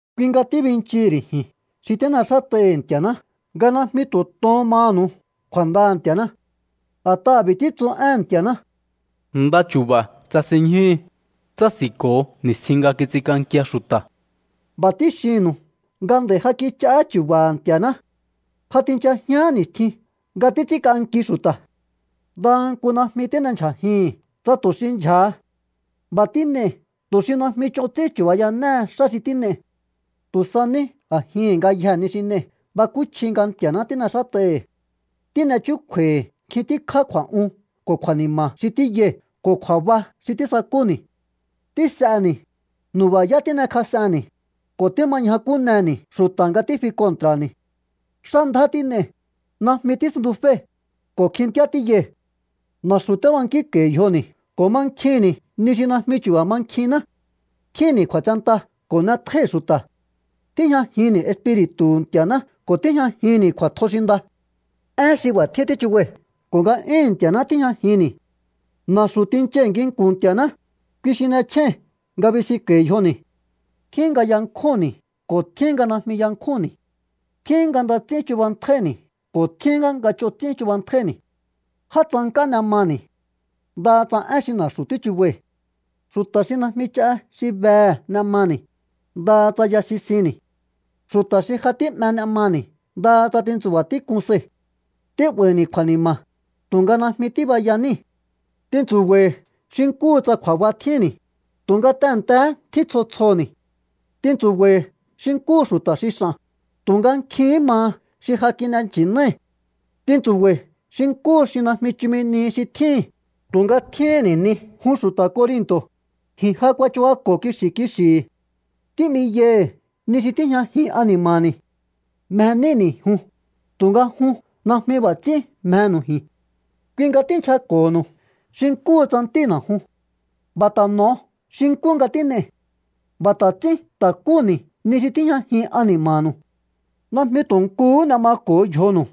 Kui nga tíbinchihi̱ ri̱ ji̱n xi tín'exát'ai̱hi̱ Nti̱a̱ná nga najmi tu̱ to̱hón manu̱u kju̱a̱ndaha̱ Nti̱a̱ná. A̱t'aha̱ b'i̱ títsu éhe̱n Nti̱a̱ná: Nda chu̱ba̱ tsasinñjúhu, tsási̱nko̱ho ni̱stjin nga kits'ink'ankia xu̱ta̱. B'a̱ tíxinnu̱u nga nd'a̱i̱ ja kich'aá chu̱ba̱ha̱ Nti̱a̱ná. Ja tinchajián ni̱stjin nga títs'ínk'anki xu̱ta̱. Ndaha nku najmi tín'endyjajii̱hi̱n tsa tu̱ xi ndyja̱ha. B'a̱ tín'ei̱ tu̱ xi najmi ch'on ts'ín chu̱bayanéhe xá xi tín'ei̱. Tu̱ sa ní a̱jihi̱n ngayjee̱ ni xi n'ei̱ bakúchji nga Nti̱a̱ná tín'exát'ai̱hi̱. Tín'e chúkju̱a̱i̱ nkjin tíkjá kju̱a̱'un ko̱ kju̱a̱ni̱ma̱ xi tíyai̱ ko̱ kju̱a̱ba xi tísakúni̱. Tís'eni̱, nu̱ba̱yá tín'ekjas'enni̱, ko̱ tíma ñjakúneni̱ xu̱ta̱ nga tífi kontra̱ni̱. Xá ndjá tín'ei̱, najmi tísuntuféi̱, ko̱ kjintíá tíyai̱. Na̱xu̱ tíbankínko̱i̱ yjoni̱ ko̱ mankjinni̱ ni xi najmi chu̱ba̱ mankjiná. Tjínni̱ kju̱a̱tsenta ko̱ n'etjóíhi̱ xu̱ta̱. Tíjñajinni̱ Espiri̱tu̱hu̱ Nti̱a̱ná ko̱ tíjñajinni̱ kju̱a̱tjo xi nda. Én xi b'a̱ tjín tíchubai̱ ko̱ nga'yúhu̱n Nti̱a̱ná tíjñajinni̱. Na̱xu̱ tinchai̱ nginku̱n Nti̱a̱ná, kui xi n'echjéi̱n nga binsinko̱i̱ yjoni̱. Tjín nga yankjúnni̱ ko̱ tjín nga najmi yankjúnni̱. Tjín nga nda ts'ín chubantjáíni̱ ko̱ tjín nga ch'on ts'ín chubantjáíni̱. Já tsank'á n'e mani̱, ndaha tsa én xi na̱xu̱ tíchubai̱. Xu̱ta̱ xi najmi ch'a xi behe̱ n'e mani̱, ndaha tsa ya sisinni̱. Xu̱ta̱ xi ja tí'me n'e mani̱, ndaha tsa tintsu̱ba̱ tík'un sai̱. Tí'ba̱i̱ni̱ kju̱a̱ni̱ma̱, tu̱nga najmi tíbaya níi̱. Tintsu̱ba̱i̱ xi nkúhu tsa kju̱a̱ba tjínni̱, tu̱nga tehe̱ntehé tjín tsjo tsjoni̱. Tintsu̱ba̱i̱ xi nkúhu xu̱ta̱ xi x'a̱n, tu̱nga nkjihín maha xi ja kin'e nchi̱nái̱. Tintsu̱ba̱i̱ xi nkúhu xi najmi chumi nihi xi tjíhi̱n, tu̱nga tjíhínni̱ ni. Jun xu̱ta̱ Corinto̱, ji̱n ja kuachubako̱ kixi̱ kixi̱hi̱. Tí'miyai̱hi̱ ni xi tíjñajin ani̱ma̱ni̱. Mje níni̱ jun, tu̱nga jun najmi b'a̱ ts'ín mjenu̱u ji̱n. Kui nga tínchjako̱ho̱nu̱u xi nkúhu tsa ntína̱ jun. B'a̱ ta̱ n'o̱o xi nkú nga tín'ei̱. B'a̱ ta̱ ts'ín ta̱kúni̱ ni xi tíjñajin ani̱ma̱nu̱u. Najmi tu̱ nkuhú n'e mako̱o yjonu̱u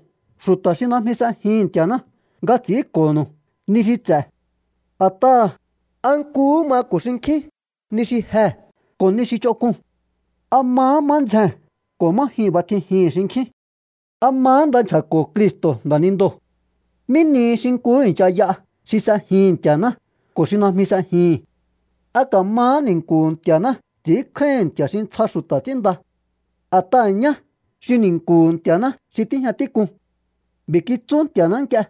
xu̱ta̱ xi najmi s'ejihi̱n Nti̱a̱ná nga ts'i̱ínko̱nu̱u ni xi ts'e̱. A̱t'aha̱, ¿a nkuhú mako̱ xinkjín ni xi jee̱ ko̱ ni xi ch'onk'uu̱n? ¿A mahá má ndzjee̱n ko̱ má jyuu̱n b'atjijihi̱n xinkjín? ¿A mahá nda nchja̱ko̱ Cristo̱ nda̱nindoo̱? ¿Mí ni xi nkuhú i̱ncha y'a xi s'ejihi̱n Nti̱a̱ná ko̱ xi najmi s'ejihi̱n? ¿A ka̱mahá ni̱nku̱hu̱ Nti̱a̱ná ts'i̱ínkjáíhi̱n nti̱a̱ xi ntsja xu̱ta̱ ts'ínnda? A̱t'aha̱ ñá xi ni̱nku̱hu̱ Nti̱a̱ná xi tíjña tík'uu̱n. B'i̱ kitsú Nti̱a̱ná nk'ie: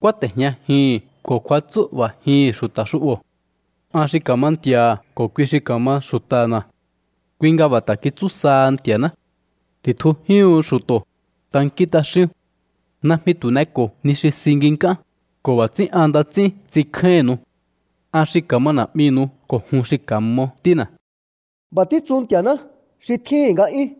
Kúáte̱jñajihi̱n ko̱ kjuatsú'ba̱jihi̱n xu̱ta̱ xu'bo̱. An xi ka̱ma Nti̱a̱ha̱ ko̱ kui xi ka̱ma xu̱ta̱na̱. Kui nga b'a̱ ta̱ kitsú saha Nti̱a̱ná: Ti̱tjujíúhu̱n xu̱to̱, tankín t'axíún. Najmi tu̱ n'eko̱o ni xi si nginkán, ko̱ b'a̱ ts'ín an nda ts'ín ts'inkjáínnu̱u. An xi ka̱ma Na̱'minu̱u ko̱ jun xi ka̱mo ntína̱. B'a̱ títsu Nti̱a̱ná xi tjíhi̱n nga'yún.